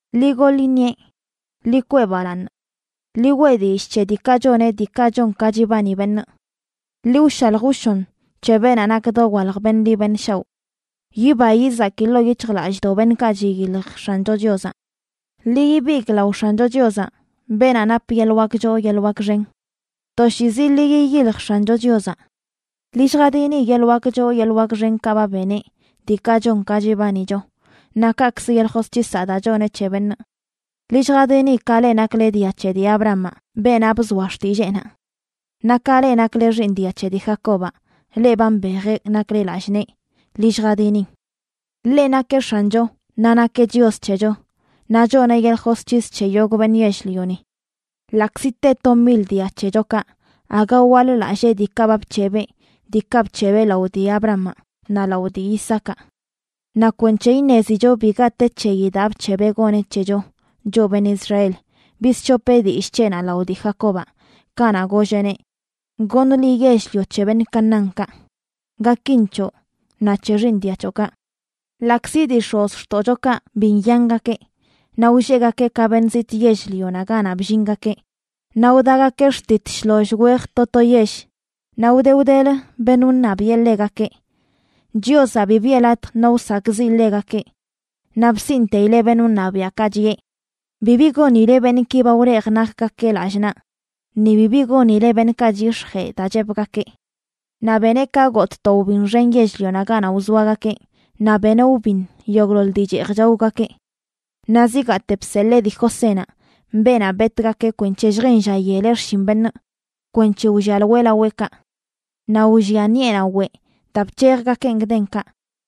Ḻi goḻ iṉieꞌ, ḻi kwee balaaṉ. Ḻi weꞌ dillꞌ c̱he diikaꞌ choneꞌ diikaꞌ chon ka chibani beṉꞌ. Ḻi wshalj wshon c̱he beenaꞌ nak dowalj beṉꞌ ḻi beṉꞌ shaoꞌ. Yiba yizaki ḻoo yic̱hjlallꞌdoꞌ beṉꞌkaꞌ chiyilj X̱ancho Chiozaꞌ. Ḻi ibigꞌ lao X̱ancho Chiozaꞌ, beenaꞌ nap yeḻꞌ wak choo yeḻꞌ wak xen. Toshiizi ḻi yiyilj X̱ancho Chiozaꞌ. Ḻi lljadini yeḻꞌ wak choo yeḻꞌ wak xenkaꞌ ba beneꞌ, diikaꞌ chon ka chibanicho, naꞌ kaꞌkzə yeḻꞌ josc̱hisaꞌ daa choneꞌ c̱he beṉꞌ. Ḻi lljadini, ka leꞌ nakle dia c̱he dii Abrahamaꞌ, beenaꞌ bzoa xtilleenaꞌ. Naꞌ ka leꞌ nakle xiiṉ dia c̱he dii Jacobaꞌ, leꞌ ba mbejeꞌ nakle lallꞌ nee, ḻi lljadinin. Ḻeꞌ nakeꞌ X̱ancho, naꞌ nakeꞌ Chios c̱hecho, naꞌ choneꞌ yeḻꞌ josc̱his c̱he yogꞌ beṉꞌ yell-lioni. Ḻaꞌkzi te to mil dia c̱hechokaꞌ, aga waḻ-lallee diikaꞌ ba bc̱hebeꞌ, diikaꞌ bc̱hebeꞌ lao dii Abrahamaꞌ naꞌ lao dii Isaacaꞌ. Naꞌ kwenc̱he iṉezicho biga te c̱heyi daa bc̱hebeꞌ goneꞌ c̱hecho, choꞌ beṉꞌ Israel, bizc̱hopeꞌ dillꞌ c̱heꞌnaꞌ lao dii Jacobaꞌ, kanaꞌ golleꞌneꞌ: “Goṉ liꞌ yell-lio c̱he beṉꞌ Canaánkaꞌ, gakin c̱hoꞌ naꞌ c̱he xiiṉ dia c̱hoꞌkaꞌ.” Ḻaꞌkzi dii x̱ozxtoꞌchokaꞌ bi nyangakeꞌ naꞌ wlleꞌgakeꞌ ka beṉꞌ zitꞌ yell-lionaꞌ ganaꞌ bllingakeꞌ, naꞌ wdagakeꞌ xtit shloll wej to to yell, naꞌ wde wdelə beṉꞌ wṉabiꞌe ḻegakeꞌ, Chiozaꞌ bi biꞌe latj no wsakꞌziꞌ ḻegakeꞌ, naꞌ bsiꞌnteileꞌ beṉꞌ wṉabiaꞌkaꞌ, chiꞌe: “Bibi gonile beṉꞌki ba wlejꞌ nakgakeꞌ lallꞌ naꞌ, ni bibi gonile beṉꞌkaꞌ chyix̱jee daa chepgakee.” Naꞌ beneꞌ ka gotꞌ to wbin xen yell-lionaꞌ ganaꞌ wzoagakeꞌ, naꞌ beneꞌ wbin yogꞌḻoḻ dii cheej chaogakeꞌ. Naꞌ zigaate bseḻee dii Josénaꞌ, beenaꞌ betꞌgakeꞌ kwenc̱he lljen lla yeleꞌ xshin beṉꞌ, kwenc̱he wllialoeꞌ laweꞌkaꞌ. Naꞌ wllia ṉiꞌenaꞌ weꞌ daa bc̱hejgakeꞌn gdenkaꞌ,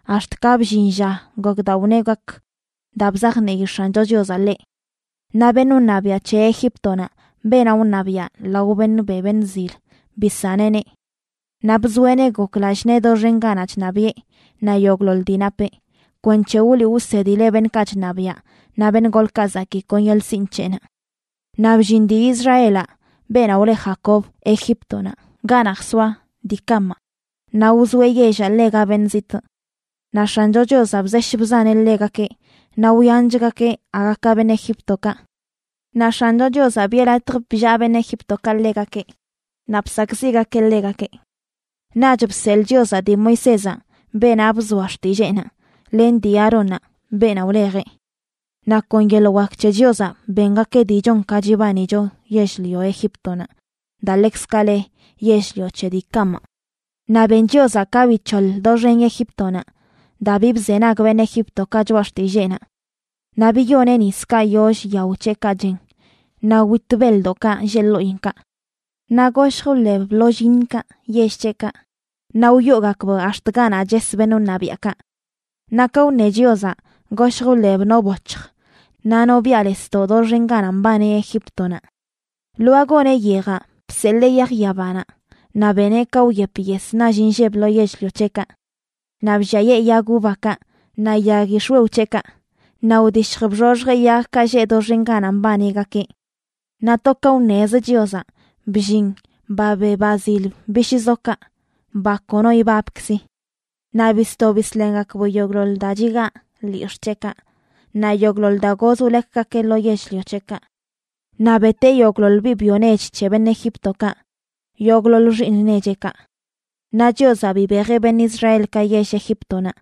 ax̱t ka bllin lla gok daa wneꞌ gak, daa bzajnii X̱ancho Chiozaꞌ ḻeꞌ. Naꞌ beṉꞌ wṉabiaꞌ c̱he Egíptonaꞌ, beenaꞌ wṉabiaꞌ lao beṉꞌ be beṉꞌ zil, bisaneꞌneꞌ. Naꞌ bzoeꞌneꞌ gok lallꞌ nee doxen ganaꞌ chṉabiꞌe, naꞌ yogꞌḻoḻ dii napeꞌ, kwenc̱he wliꞌ wsedileꞌ beṉꞌkaꞌ chṉabiaꞌ naꞌ beṉꞌ golkaꞌ zakii kon yeḻꞌ sinꞌ c̱heꞌnaꞌ. Naꞌ bllin dii Israelaꞌ, beenaꞌ wle Jacob, Egíptonaꞌ, ganaꞌ jsoa dii Camaꞌ, naꞌ wzoeꞌ yellaꞌ ḻega beṉꞌ zitꞌ. Naꞌ X̱ancho Chiozaꞌ bzesh bzaneꞌ ḻegakeꞌ, naꞌ wyanchgakeꞌ aga ka beṉꞌ Egíptokaꞌ. Naꞌ X̱ancho Chiozaꞌ biꞌe latj bllaa beṉꞌ Egíptokaꞌ ḻegakeꞌ, naꞌ bsakꞌziꞌgakeꞌ ḻegakeꞌ. Naꞌch bseḻꞌ Chiozaꞌ dii Moisézaꞌ, beenaꞌ bzoa xtilleenaꞌ, len dii Aarónnaꞌ, beenaꞌ wlejeꞌ. Naꞌ kon yeḻꞌ wak c̱he Chiozaꞌ bengakeꞌ dii chon ka chibanicho yell-lio Egíptonaꞌ, daa ḻekzkaꞌ le yell-lio c̱he dii Camaꞌ. Naꞌ ben Chiozaꞌ ka bic̱hoḻ doxen Egíptonaꞌ, daa bi bzenag beṉꞌ Egíptokaꞌ choꞌa xtilleenaꞌ. Naꞌ biyoneꞌ niskaꞌ yoll yao c̱heꞌkaꞌ chen, naꞌ wit beḻdoꞌkaꞌ lleꞌ ḻoꞌinkaꞌ. Naꞌ goshj wḻeb bḻoll yiṉkaꞌ yell c̱heꞌkaꞌ, naꞌ wyoogakb ax̱t ganaꞌ ches beṉꞌ wṉabiaꞌkaꞌ. Naꞌ ka wṉe Chiozaꞌ, goshj wḻeb no boc̱hj naꞌ no biꞌalesdoꞌ doxen ganaꞌ mbani Egíptonaꞌ. Lwaa goneꞌ yejaꞌ, bseḻee yaj yabanaꞌ, naꞌ beneꞌ ka wyep yes nall inlleb lo yell-lio c̱heꞌkaꞌ. Naꞌ blliayee yag uvakaꞌ naꞌ yag yix̱wew c̱heꞌkaꞌ, naꞌ wdishj bxoxjeꞌ yagkaꞌ lleꞌ doxen ganaꞌ mbanigakeꞌ. Naꞌ to ka wṉez Chiozaꞌ, bllin ba be ba zil bishꞌzokaꞌ, ba kono ibabkzi. Naꞌ bisto bisḻengakb yogꞌḻoḻ daa chigaa lyix̱ꞌ c̱heꞌkaꞌ, naꞌ yogꞌḻoḻ daa goz wlekgakeꞌ lo yell-lio c̱heꞌkaꞌ. Naꞌ beteꞌ yogꞌḻoḻ biꞌ byo nech c̱he beṉꞌ Egíptokaꞌ, yogꞌḻoḻ xiiṉ necheꞌkaꞌ. Naꞌ Chiozaꞌ bibejeꞌ beṉꞌ Israelkaꞌ yell Egíptonaꞌ,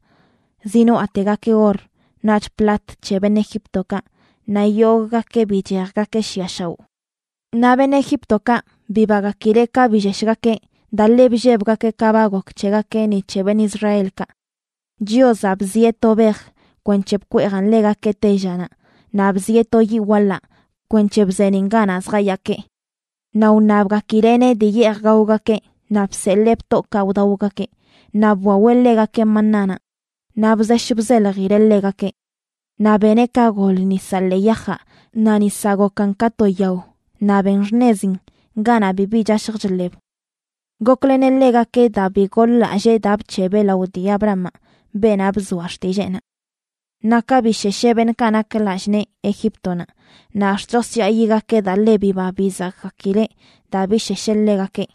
zinoaꞌtegakeꞌ or naꞌch plat c̱he beṉꞌ Egíptokaꞌ, naꞌ yogꞌgakeꞌ bichejgakeꞌ shiꞌa shaoꞌ. Naꞌ beṉꞌ Egíptokaꞌ bibagakileꞌ ka billeshgakeꞌ daa ḻe bllebgakeꞌ ka ba gok c̱hegakeꞌ ni c̱he beṉꞌ Israelkaꞌ. Chiozaꞌ bzieꞌ to bej kwenc̱he bkweejan ḻegakeꞌ tellanaꞌ, naꞌ bzieꞌ to yiꞌ waḻaꞌ kwenc̱he bzeeniꞌn ganaꞌ zjayaakeꞌ. Naꞌ wṉabgakileꞌneꞌ dii yeej gaogakeꞌ, naꞌ bseḻee btoꞌkaꞌ wdaogakeꞌ, naꞌ bwaweꞌ ḻegakeꞌ manánaꞌ naꞌ bzesh bzeljileꞌ ḻegakeꞌ. Naꞌ beneꞌ ka gol nisaꞌ ḻee yajaꞌ, naꞌ nisaꞌ gokan ka to yao naꞌ ben xṉezin ganaꞌ bibi chashj chḻeb. Gokleneꞌ ḻegakeꞌ daa bi goḻ-lallee daa bc̱hebeꞌ lao dii Abrahamaꞌ, beenaꞌ bzoa xtilleenaꞌ. Naꞌ ka bishesheꞌ beṉꞌkaꞌ nak lallꞌ nee Egíptonaꞌ, naꞌ ax̱t chosyaayigakeꞌ daa ḻe biba bizakgakileꞌ daa bishesheꞌ ḻegakeꞌ.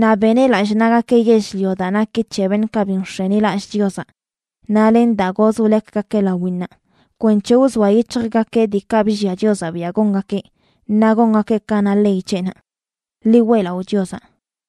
Naꞌ beneꞌ lallꞌ naꞌgakeꞌ yell-lio daa naki c̱he beṉꞌkaꞌ bi nx̱enilallꞌ Chiozaꞌ, naꞌ len daa goz wlekgakeꞌ lawinnaꞌ, kwenc̱he wzoa yic̱hjgakeꞌ diikaꞌ bllia Chiozaꞌ biaꞌ gongakeꞌ, naꞌ gongakeꞌ ka na ley c̱heꞌnaꞌ. ¡Ḻi weꞌlaꞌo Chiozaꞌ!